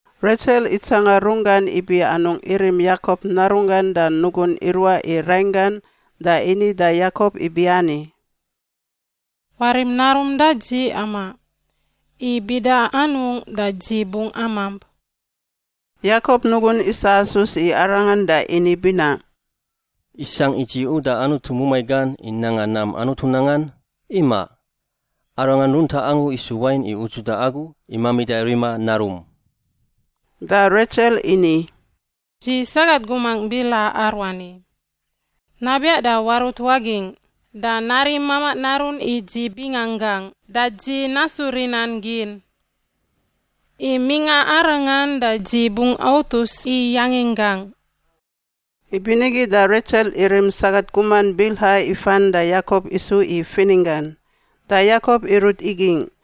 Retsel itsanga runggan ibi anungꞌ irim Yakop narunggan da nugun iruaꞌ i rainggan da ini da Yakop ibiani, “Warim narum da dzi amaꞌ. I bida anungꞌ da dzi bungꞌ amamp.” Yakop nugun isasus i arangan da ini binaꞌ, “Isangꞌ i dzi uda Anutu mumai gan i nanga nam Anutu nangan? Imaꞌ! Arangan runtaꞌ angu isu wain i udzuda agu i mamida rima narum.” Da Retsel ini, “Dzi sagat gumangꞌ Bilha aruani. Nabiaꞌ da warut wagingꞌ da narim mamaꞌ narun i dzi binganggangꞌ da dzi nasu rinan gin. I mingꞌa arangan da dzi bungꞌ autus i yanginggangꞌ.” Ibinigi da Retsel irim sagat guman Bilha ifan da Yakop isu i fininggan. Da Yakop irut igingꞌ,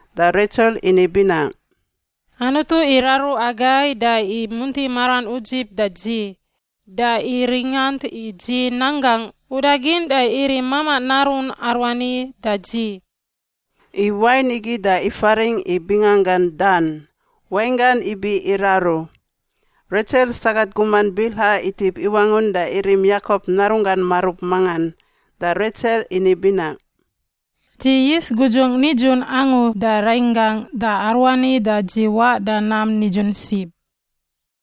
Da Retsel ini binaꞌ, “Anutu iraru agai da imunti maran udzib da dzi da iringant i dzi nan gangꞌ udagin da irim mamaꞌ narun aruani da dzi.” I wain igi da ifaringꞌ i binganggan Dan (wainggan ibi iraru). Retsel sagat guman Bilha itip iwangun da irim Yakop narunggan marub mangan. Da Retsel ini binaꞌ, “Dzi yis gudzun nidzun angu da rainggangꞌ da aruani dzi waꞌ da nam nidzun sib.”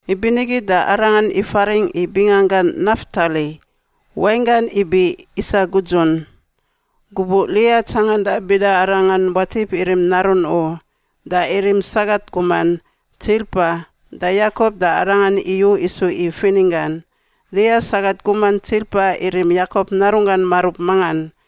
Ibinigi da arangan ifaringꞌ i binganggan Naftali (wainggan ibi isa gudzun). Gubuꞌ Lia tsanganda bida arangan watip irim narun u, da irim sagat guman, Tsilpa, da Yakop da arangan iyu isu i fininggan. Lia sagat guman Tsilpa irim Yakop narunggan marub mangan.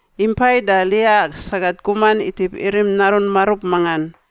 Impai da Lia sagat guman itip irim narun marub mangan.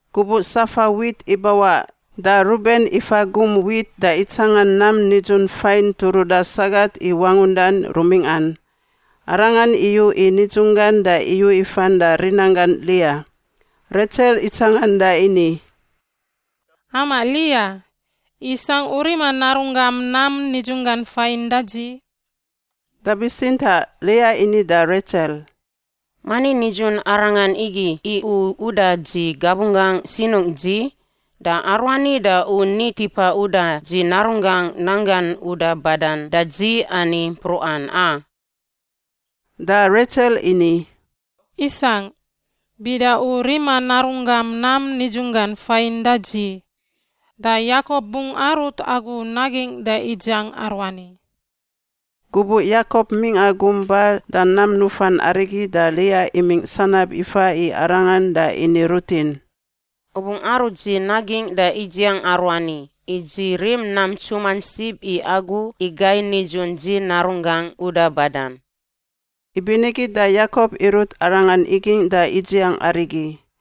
Gubuꞌ safa wit ibawaꞌ da Ruben ifa gum wit da itsangan nam nidzun fain turuda sagat i wangundan rumingꞌan. Arangan iyu i nidzunggan da iyu ifan da rinanggan Lia. Retsel itsangan da ini, “Amaꞌ Lia, isangꞌ u rima narunggam nam nidzunggan fain da dzi?” Da bitsintaꞌ Lia ini da Retsel, “Mani nidzun arangan igi i u uda dzi gabunggangꞌ sinungꞌ dzi? Da aruani da u ni tipa uda dzi narunggangꞌ nanggan uda badan da dzi ani mpruꞌan, a!” Da Retsel ini, “Isangꞌ. Bida u rima narunggam nam nidzunggan fain da dzi, da Yakop bungꞌ arut agu nagingꞌ da idziang aruani.” Gubuꞌ Yakop mingꞌa gum ba da nam nufan arigi da Lia imingꞌ sanab ifa i arangan da ini rutin, “U bungꞌ arut dzi nagingꞌ da idziang aruani, i dzi rim nam ntsuman sib i agu i gai nidzun dzi narunggangꞌ uda badan.” Ibinigi da Yakop irut arangan igingꞌ da idziang arigi.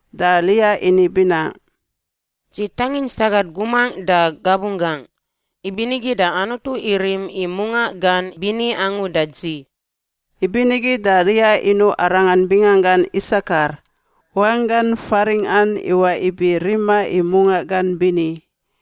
Da Lia ini binaꞌ, “Dzi tangin sagat gumangꞌ da gabunggangꞌ, ibinigi da Anutu irim i mungaꞌ gan bini angu da dzi.” Ibinigi da Lia inuꞌ arangan binganggan Isakar (wanggan faringꞌan iwaꞌ ibi rima i mungaꞌ gan bini).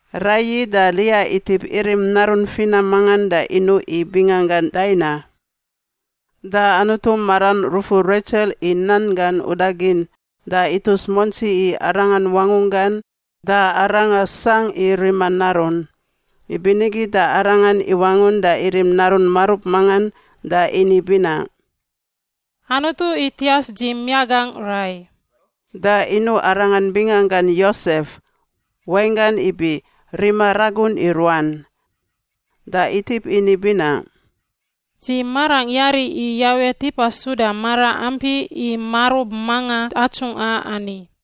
Raiyi da Lia itip irim narun finam mangan da inuꞌ i binganggan Daina. Da Anutu maran rufur Retsel i nan gan udagin da itus muantsi i arangan wangunggan da aranga sangꞌ i rima narun. Ibinigi da arangan iwangun da irim narun marub mangan da ini binaꞌ, “Anutu itias dzi miaꞌ gangꞌ rai.” Da inuꞌ arangan binganggan Yosef (wainggan ibi rima ragun i ruan). Da itip ini binaꞌ, “Dzi marangꞌ yari i Yawe tipa suda mara ampi i marub manga atsungꞌa ani.”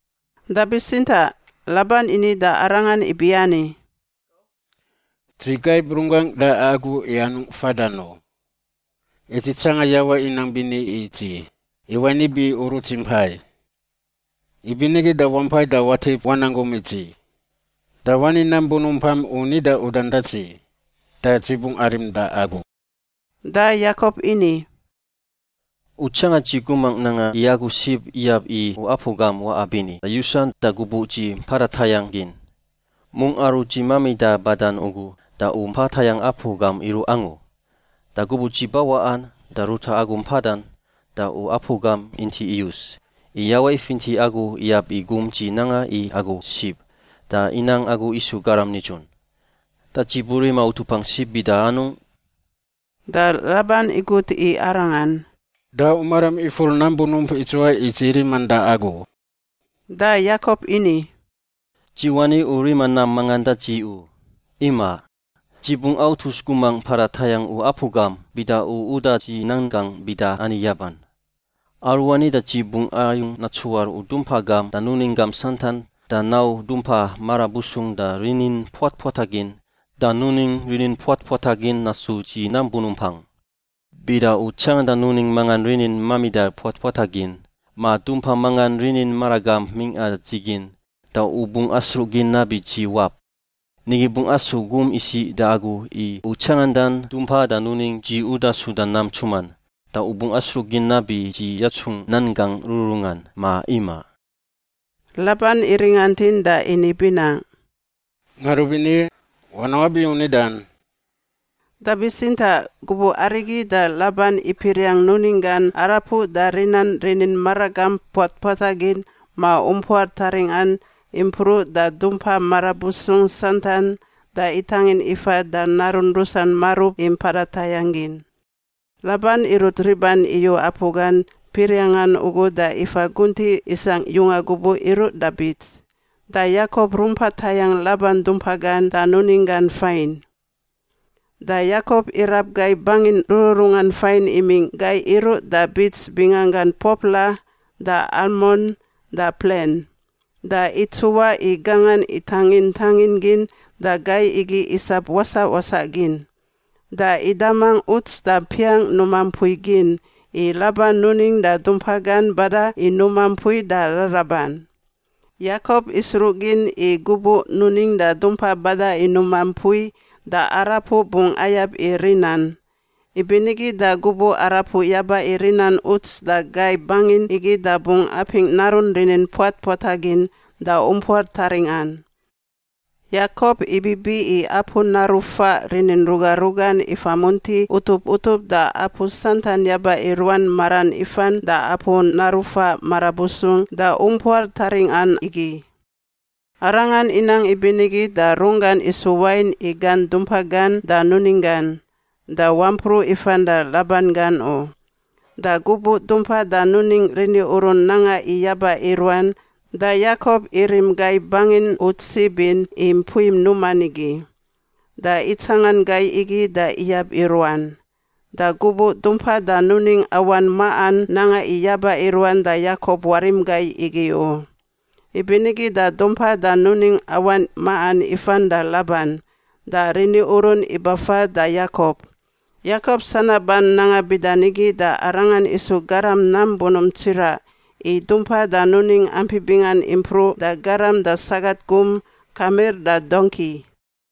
Da bitsintaꞌ Laban ini da arangan ibiani, “Dzi gaib runggangꞌ da agu i anungꞌ fadan u. I dzi tsanga Yawe inang bini i dzi, i wain ibi u rut dzi impai. Ibinigi da wampai da watip wanang gum i dzi. Da wani nam bunumpam u nida udan da dzi, da dzi bungꞌ arim da agu.” Da Yakop ini, “U tsanga dzi gumangꞌ nanga i agu sib iyab i u apu gam waꞌa bini da yusan da gubuꞌ dzi mpada tayangꞌ gin. Mungꞌ aru dzi mamida badan ugu da u mpa tayangꞌ apu gam iruꞌ angu. Da gubuꞌ dzi bawaꞌan da ruta agu mpadan da u apu gam inti iyus, i Yawe ifinti agu iyab i gum dzi nanga i agu sib da inang agu isu garam nidzun. Da dzi burima utupangꞌ sib bida anungꞌ?” Da Laban igut i arangan, “Da u maram ifur nam bunump idzuwai i dzi riman da agu?” Da Yakop ini, “Dzi wani u rima nam mangan da dzi u, imaꞌ. Dzi bungꞌ autus gumangꞌ mpada tayangꞌ u apu gam, bida u uda dzi nan gangꞌ bida ani yaban: Aruani da dzi bungꞌ ayung natsuar u dumpa gam da nuning gam santan da nau dumpa marabusung da rinin puatpuatagin da nuning rinin puatpuatagin nasu dzi nam bunumpangꞌ. Bida u tsanganda nuning mangan rinin mamida puatpuatagin ma dumpa mangan rinin maragamp mingꞌa dzi gin, da u bungꞌ asruꞌgin nabi dzi wap. Nigi bungꞌ asu gum isiꞌ da agu i u tsangandan dumpa da nuning dzi uda suda nam ntsuman, da u bungꞌ asruꞌgin nabi dzi yatsungꞌ nan gangꞌ rururungan, ma imaꞌ.” Laban iringantin da ini binaꞌ, “Ngarubini. Wanang wabi u nidan.” Da bitsintaꞌ gubuꞌ arigi da Laban ipiriang nuning gan arapuꞌ da rinan rini maragamp puatpuatagin ma umpuar taringꞌan impruꞌ da dumpa marabusung santan da itangin ifa da narun rusan marub i mpada tayangꞌ gin. Laban irut riban iyu apu gan piriangꞌan ugu da ifa guntiꞌ isangꞌ yunga gubuꞌ iruꞌ da bits. Da Yakop rumpa tayangꞌ Laban dumpa gan da nuning gan fain. Da Yakop irab gai bangin rururungan fain imingꞌ gai iruꞌ da bits binganggan popla da almon da plen, da itsuwaꞌ i gangan itangin tangin gin da gai igi isap wasaꞌ wasaꞌ gin. Da idamangꞌ uts da piangꞌ numa mpui gin i Laban nuning da dumpa gan bada i numa mpui da raraban. Yakop isruꞌgin i gubuꞌ nuning da dumpa bada i numa mpui da arapuꞌ bungꞌ ayab i rinan. Ibinigi da gubuꞌ arapuꞌ yaba i rinan uts da gai bangin igi da bungꞌ apingꞌ narun rinin puatpuatagin da umpuar taringꞌan. Yakop ibibi i apu naru faꞌ rinin ruga rugan ifa munti utup utup da apu santan yaba i ruan maran ifan da apu naru faꞌ marabusung da umpuar taringꞌan igi. Arangan inang ibinigi da runggan isu wain i gan dumpa gan da nuning gan, da wampruꞌ ifan da Laban gan u. Da gubuꞌ dumpa da nuning riniurun nanga i yaba i ruan da Yakop irim gai bangin uts sib in i mpui numan igi. Da itsangan gai igi da iyab i ruan. Da gubuꞌ dumpa da nuning awan maꞌan nanga i yaba i ruan da Yakop warim gai igi u. Ibinigi da dumpa da nuning awan maꞌan ifan da Laban, da riniurun ibafa da Yakop. Yakop sanaban nanga bida nigi da aranga isu garam nam bunump tsiraꞌ i dumpa da nuning ampi bingan impruꞌ da garam da sagat gum, kamir da dongki.